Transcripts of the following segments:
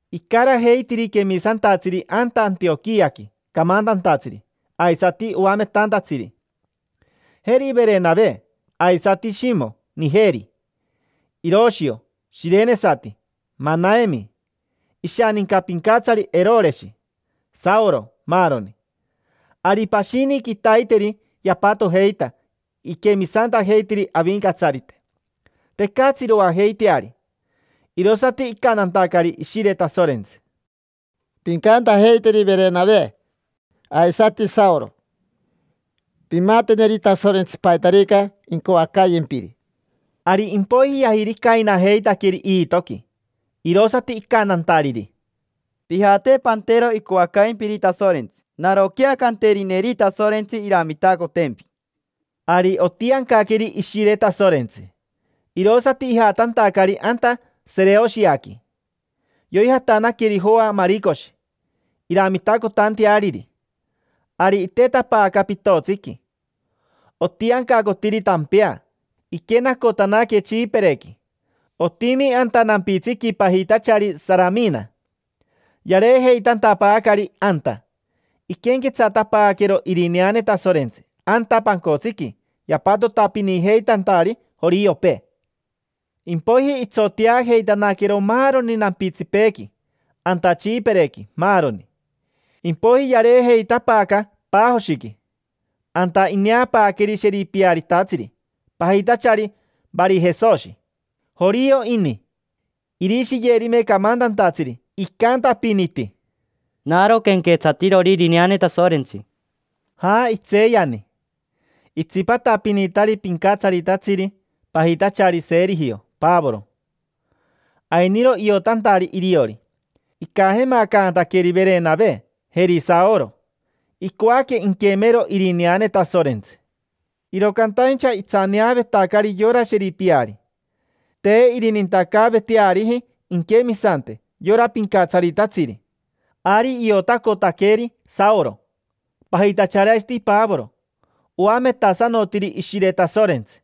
Icarajeitiri quemisantatsiri anta Antioquiaqui camantantatsiri, aisati oametantatsiri: jeri Verenave, aisati Shimo Nijeri. Iroshio shirenesati, Manaemi ishaninca pincatsari Eroreshi, Saoro, maaroni. Ari pashini quitaiteri yapatojeita iquemisantajeitiri Avincatsarite, tecatsi iroajeiteari. Irosati icantantacari Ishire Tasorentsi: —Pincantajeiteri Verenave aisati Saoro: “Pimateneri Tasorentsi paitarica incoacayempiri”. Ari impoiji yajiricainajeitaqueri iitoqui, irosati icantantariri: —Pijate pantero icoacaimpiri Tasorentsi, naroquea canterineri Tasorentsi iramitacotempi. Ari otiancaqueri Ishire Tasorentsi, irosati ijatantacari anta Sereoshiaqui. Yoijatanaqueri Joa Maricoshi iramitacotanteariri. Ari itetapaaca pitotsiqui. Otiancacotiri tampea, iquenacotanaque Tsipirequi. Otimi anta nampitsiqui pajitachari Saramina: yareejeitantapaacari anta, iquenquetsatapaaquero irineane Tasorentsi anta pancotsiqui yapatotapinijeitantari joriopee. Impoiji itsoteajeitanaquero maaroni nampitsipeequi anta Tsipirequi, maaroni. Impoiji yareejeitapaaca Pajoshiqui. Anta ineapaaqueri sheripiaritatsiri, pajitachari Varijesoshi. Jorio ini. Irishiyerime camantantatsiri, icantapiniti: —Naro quenquetsatirori irineane Tasorentsi. Ja, itseeyani. Itsipatapinitari pincatsaritatsiri pajitachari Serijio Pavoro. Ainiro iotantari iriori. Icajemacantaqueri Verenave, jeri Saoro: icoaque inquemero irineane Tasorentsi. Iro cantaincha itsaneavetacari yora sheripiari: te irinintacaaveteariji inquemisante yora pincatsaritatsiri. Ari iotacotaqueri Saoro, pajitachari aisati Pavoro. Oametasanotiri Ishire Tasorentsi,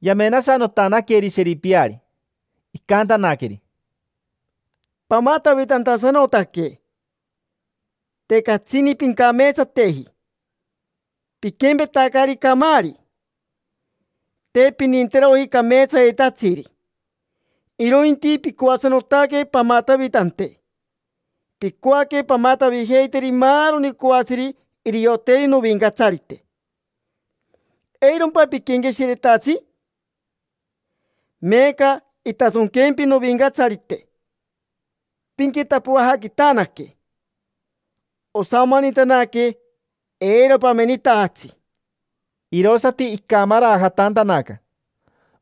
yamenasanotanaqueri sheripiari, icantanaqueri: —Pamatavitantasanotaque. Te catsini pincameetsateji: piquempetacari camaari. Te pininteroji cameetsayetatsiri, irointi picoasanotaque pamatavitante. Picoaque pamatavijeiteri maaroni coatsiri irioteri Novincatsarite. ¿Eirompa piquenqueshiretatsi? Meeca intasonquempi Novincatsarite pinquitapoajaquitanaque. Osamanitanaque, eiro pamenitajatsi. Irosati icamarajatantanaca,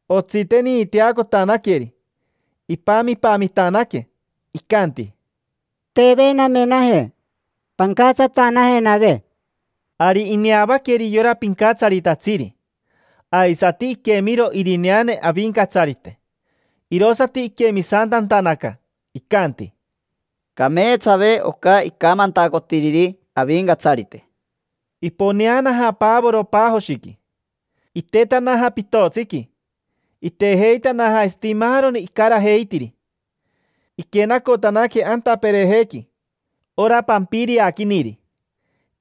otsiteniiteacotanaqueri. Ipamipamitanaque, pami, pami; icanti: —Teve namenajeve. Pancatsatanajenave. Ari ineavaqueri yora pincatsaritatsiri, aisati iquemiro irineane Avincatsarite, irosati iquemisantantanaca. Icanti: —Cameetsave oca icamantacotiriri Avincatsarite. Iponeanaja Pavoro Pajoshiqui, itetanaja pitotsiqui, itejeitanaja aisati maaroni icarajeitiri. Iquenacotanaque anta Perejequi, ora Pampiriaquiniri.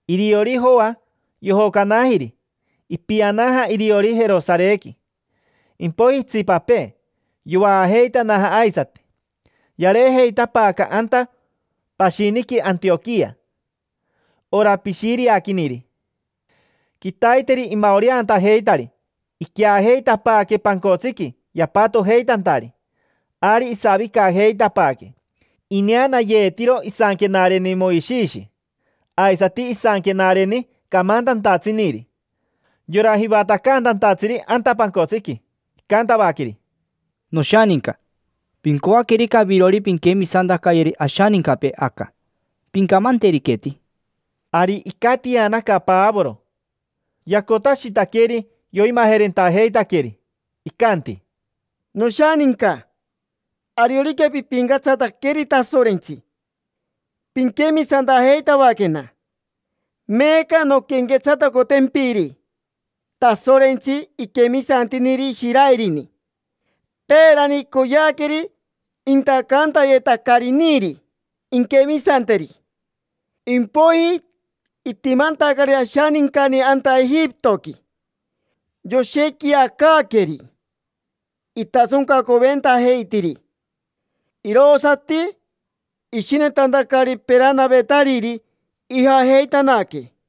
Iriori Joa yojocanajiri, ipianaja iriori Jerosarequi. Impoiji itsipapee, yovaajeitanaja aisati. Yareejeitapaaca anta pashiniqui Antioquia: ora Pishiriaquiniri. Quitaiteri imaoreantajeitari iqueajeitapaaque pancotsiqui yapatojeitantari, ari isavicajeitapaaque. Ineanayeetiro isanquenareni Moishishi, aisati isanquenareni camantantatsiniri. Yora jivatacantantatsiri anta pancotsiqui, icantavaqueri: —Noshaninca, pincoaquerica avirori pinquemisantacayeri ashanincapee aca, pincamanteriqueti. Ari icatianaca Pavoro, yacotashitaqueri yoimajerentajeitaqueri. Icanti: —Noshaninca, ariorica pipincatsataqueri Tasorentsi, pinquemisantajeitavaquena. Meeca nonquenquetsatacotempiri Tasorentsi iquemisantiniri Ishiraerini. Peerani icoyeaqueri intacantayetacariniri inquemisanteri. Impoiji, itimantacari ashanincani anta Ejipitoqui, yoshequiacaaqueri. Itasoncacoventajeitiri, irosati ishinetantacari peranavetariri ijajeitanaque.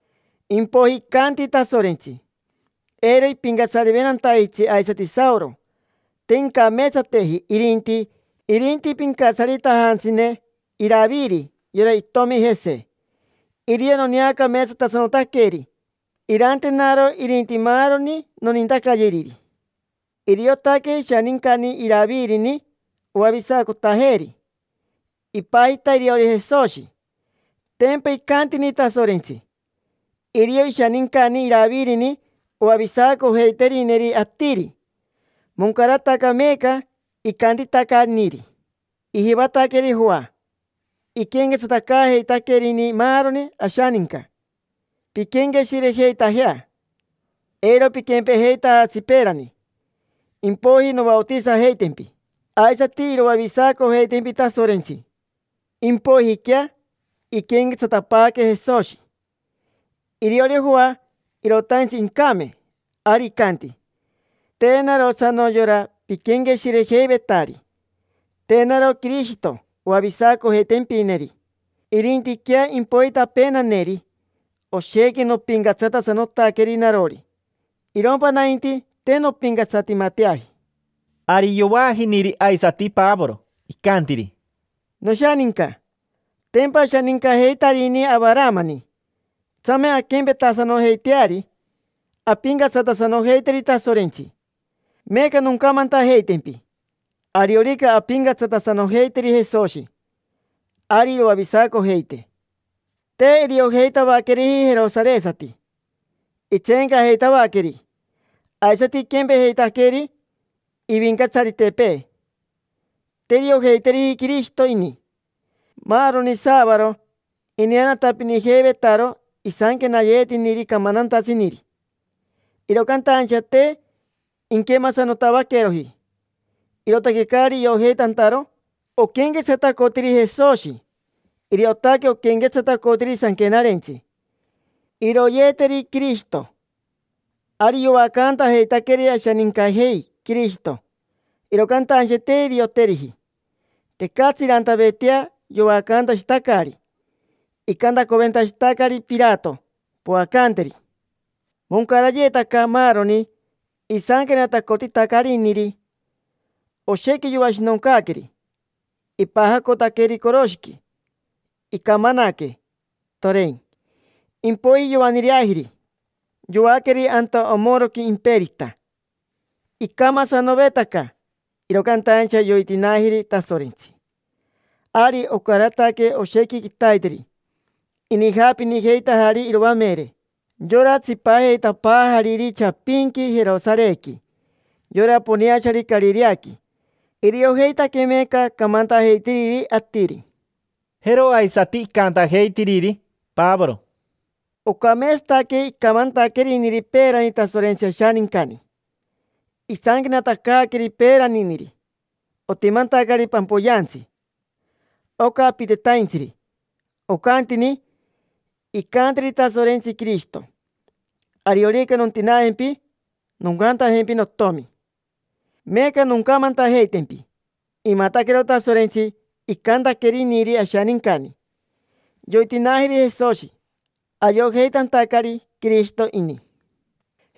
impoiji icanti Tasorentsi: “Eiro ipincatsariventantajitsi aisati Saoro, te incameetsateji, irinti pincatsaritajantsine Iraviri, yora itomi Jese. Irio noneacameetsatasanotaqueri, irantenaro irinti maaroni nonintacayeriri”. Iriotaque ishanincani Iravirini oavisacotajeeri: ipajita iriori Jesoshi. Tempa icantini Tasorentsi: “Irio ishanincani Iravirini oavisacojeiterineri atiri”. Moncarataca meeca icantitacaniri. Ijivataqueri Joa iquenquetsatacaajeitaquerini maaroni ashaninca: “Pinquenqueshirejeitajea, eiro piquempejeitajatsi peerani, impoiji novaotisajeitempi, aisati iroavisacojeitempi Tasorentsi”. Impoijiquea iquenquetsatapaaque Jesoshi. Iriori Joa irotaintsi incame, ari icanti: “Te narosano yora piquenqueshirejeivetari. Te naro Quirishito oavisacojeitempineri, irintiquea impoitapeenaneri. Oshequi nopincatsatasanotaqueri narori; irompa nainti, te nompincatsatimateaji”. Ari yovaajiniri aisati Pavoro, icantiri: —Noshaninca, tempa ashanincajeitarini Avaramani, tsame anquempetasanojeiteari, ampincatsatasanojeiteri Tasorentsi. Meeca noncamantajeitempi: ariorica ampincatsatasanojeiteri Jesoshi, ari iroavisacojeitee. Te iriojeitavaqueriji jerosaresati, itseencajeitavaqueri. Aisati iquempejeitaqueri ivincatsaritepee, te iriojeiteriji Quirishito ini. Maaroni saavaro ineanatapinijeivetaro isanquenayetiniri camantantatsiniri, iro cantaincha te inquemasanotavaqueroji, irootaque caari iojeitantaro oquenquetsatacotiri Jesoshi. Iriotaque oquenquetsatacotiri Sanquenarentsi: “Iroyeeteri Quirishito”. Ari yoacantajeitaqueri ashanincajei Quirishito, iro cantaincha te irioteriji. Tecatsi irantavetea, yoacantashitacari. Icantacoventashitacari Pirato: “Poacanteri”. Moncarayetaca maaroni isanquenatacotitacariniri: oshequi yoashinoncaaqueri, ipajacotaqueri coroshiqui, icamanaque, torein. Impoiji yoaniireajiri, yoaqueri anta omoroqui imperita. Icamasanovetaca, iro cantaincha yoitinaajiri Tasorentsi. Ari ocarataque oshequi quitaiteri inijaapinijeitajari iroamere, yora tsipajeitapaajariri chapinqui Jerosarequi: yora poneachari Carireaqui. Iriojeitaque meeca camantajeitiriri atiri. Jero aisati icantajeitiriri Pavoro: —Ocameetsataque icamantaqueriniri peerani Tasorentsi ashanincani. Isanquenatacaaqueri peeraniniri otimantacari pampoyeantsi, oca apitetaintsiri. Ocantini: “Incanteri Tasorentsi Quirishito: ‘Ariorica nontinaajempi noncantajempi notomi’”. Meeca noncamantajeitempi: imataquero Tasorentsi icantaqueriniri ashanincani: yoitinaajiri Jesoshi, ayojeitantacari Quirishito ini.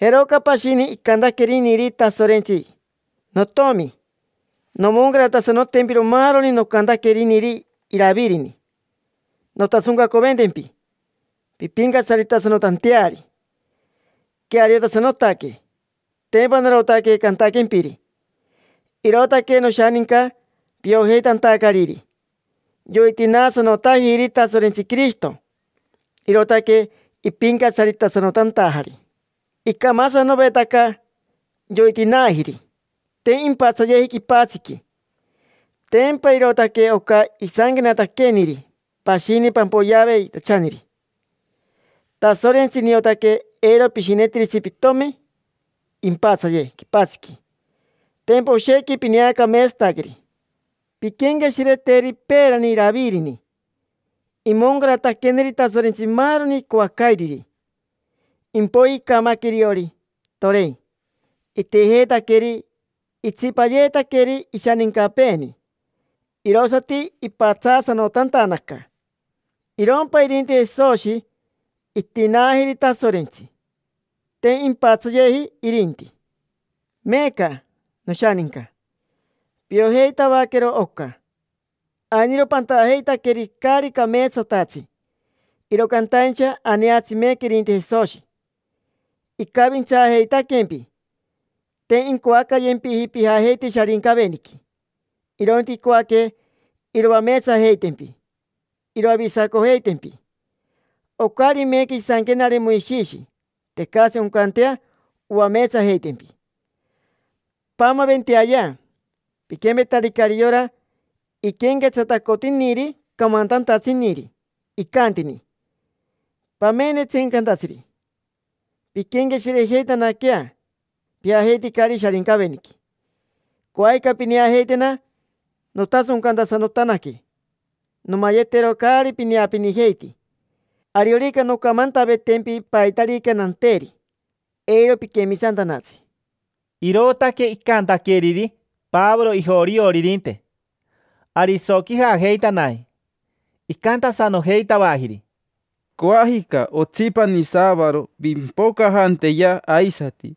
Jeroca pashini icantaqueriniri Tasorentsi: “Notiomi, nomoncaratasanotempiro maaroni nocantaqueriniri Iravirini: nontasoncacoventempi pimpincatsaritasanotanteari. Queariotasanotaque: tempa narotaque cantaquempiri”. Irootaque, noshaninca, piojeitantacariri yoitinaasanotajiri Tasorentsi Quirishito, irootaque ipincatsaritasanotantajari. Icamasanovetaca, yoitinaajiri, te impatsayeji quipatsiqui. Tempa irootaque oca isanquenataqueniri pashini pampoyeaveitachaniri: “Tasorentsi, niotaque eiro pishinetiritsi pitomi impatsaye quipatsiqui: tempa oshequi pineacameetsataqueri”. Pinquenqueshireteri peerani Iravirini, imoncarataqueneri Tasorentsi maaroni icoacairiri. Impoiji icamaque iriori, torein. Itijeetaqueri, itsipayeetaqueri ishanincapeeni, irosati ipatsaasanotantanaca. Irompa irinti Jesoshi itinaajiri Tasorentsi, te impatsayeji irinti. Meeca, noshaninca, piojeitavaquero oca. Ainiro pantajeitaqueri caari cameetsatatsi, iro cantaincha aneatsi meeca irinti Jesoshi, icavintsaajeitaquempi. Te incoacayempiji pijajeite Sharincaveniqui, irointi icoaque iroameetsajeitempi, iroavisacojeitempi. Ocari meeca isanquenare Moishishi, tecatsi oncantea oameetsajeitempi. Paamaventeayea, piquempetaricari yora iquenquetsatacotiniri camantantatsiniri icantini: “Pamene, tseencantatsiri, pinquenqueshirejeitanaquea: pijajeiticari Sharincaveniqui. Coajica pineajeitena nontasoncantasanotanaque, nomayetero caari pineapinijeiti. Ariorica noncamantavetempi paitarica nanteri, eiro piquemisantanatsi”. Irootaque icantaqueriri Pavoro ijorioririnte. Ari isoquijajeitanaji, icantasanojeitavajiri: —Coajica otsipani saavaro pimpocajanteya aisati.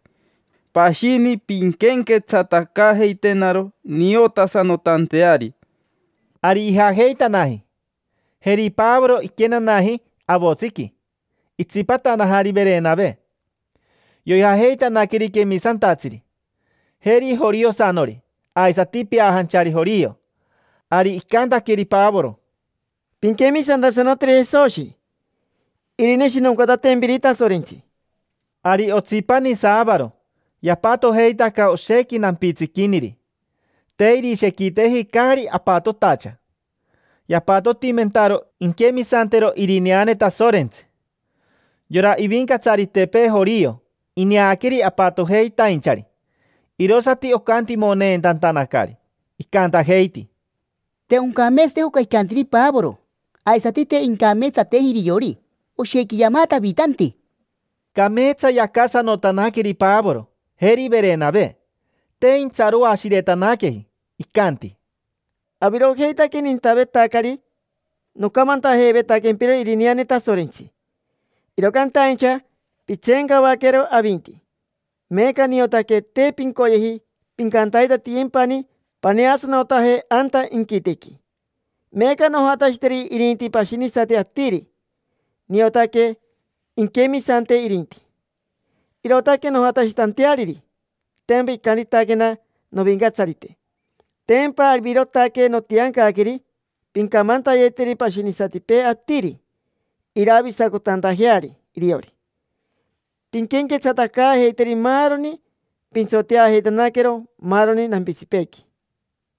Pashini pinquenquetsatacaajeitenaro niotasanotanteari. Ari ijajeitanaji. Jeri Pavoro iquenanaji avotsiqui, itsipatanajari Verenave. Yoijajeitanaqueri quemisantatsiri: jeri joriosanori aisati peajanchari jorio. Ari icantaqueri Pavoro: —Pinquemisantasanoteri Jesoshi irineshinoncatantempiri Tasorentsi. Ari otsipani saavaro yapatojeitaca oshequi nampitsiquiniri. Te irishequiteji caari apatotacha. Yapatotimentaro inquemisantero irineane Tasorentsi. Yora ivincatsaritepee jorio ineaqueri apatojeitainchari, irosati ocantimoneentantanacari. Icantajeiti: —Te oncameetsateji oca icantiri Pavoro, aisati te incameetsateji iriori. Oshequi yamatavitanti. Cameetsa yacasanotanaqueri Pavoro, jeri Verenave. Te intsaroashiretanaqueji, icanti: —Avirojeitaque nintavetacari nocamantajeivetaquempiro irineane Tasorentsi, iro cantaincha pitseencavaquero avinti. Meeca niotaque te pincoyeji pincantaitatiyempani paneasanotaje anta inquitequi. Meeca nojatashiteri irinti pashinisati atiri, niotaque inquemisante irinti. Irootaque nojatashitanteariri, tempa icantitaquena Novincatsarite: “Tempa avirotaque notiancaqueri pincamantayeteri pashinisatipee atiri, iravisacotantajeari iriori. Pinquenquetsatacaajeiteri maaroni, pintsoteajeitanaquero maaroni nampitsipeequi”.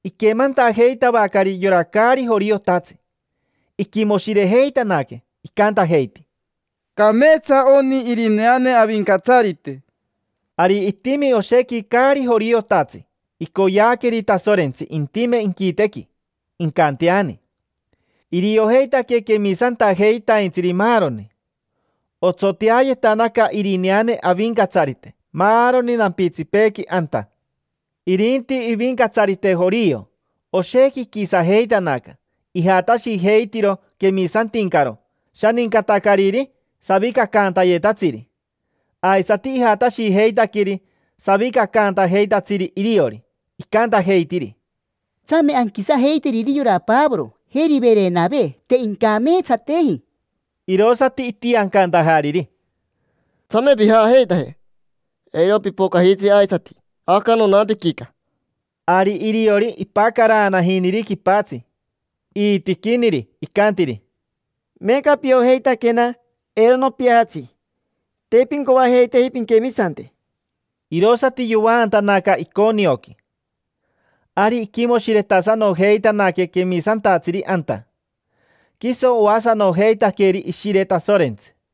Iquemantajeitavacari yora caari joriotatsi, iquimoshirejeitanaque. Icantajeiti: —Cameetsa oni irineane Avincatsarite. Ari itimi oshequi caari joriotatsi icoyeaqueri Tasorentsi intime inquitequi, incanteani: iriojeitaque quemisantajeitaintsiri, maaroni. Otsoteayetanaca irineane Avincatsarite maaroni nampitsipeequi anta. Irinti ivincatsarite jorio, oshequi iquisajeitanaca. Ijatashijeitiro quemisantincaro shanincatacariri savicacaantayetatsiri, aisati ijatashijeitaqueri savicacaantajeitatsiri iriori. Icantajeitiri: —Tsame, anquisajeiteri yora Pavoro, jeri Verenave. Te incameetsateji. Irosati itiancantajariri: —Tsame pijajeitaje. Eiro pipocajitsi aisati aca nonampiquica. Ari iriori, ipacaraanajiniri quipatsi iitiquiniri, pacara, pacara. Icantiri: —Meeca piojeitaquena eiro nopiajatsi. Te pincoajeiteji pinquemisante. Irosati yovaantanaca Iconioqui. Ari iquimoshiretasanojeitanaque quemisantatsiri anta. Quiso oasanojeitaqueri Ishire Tasorentsi.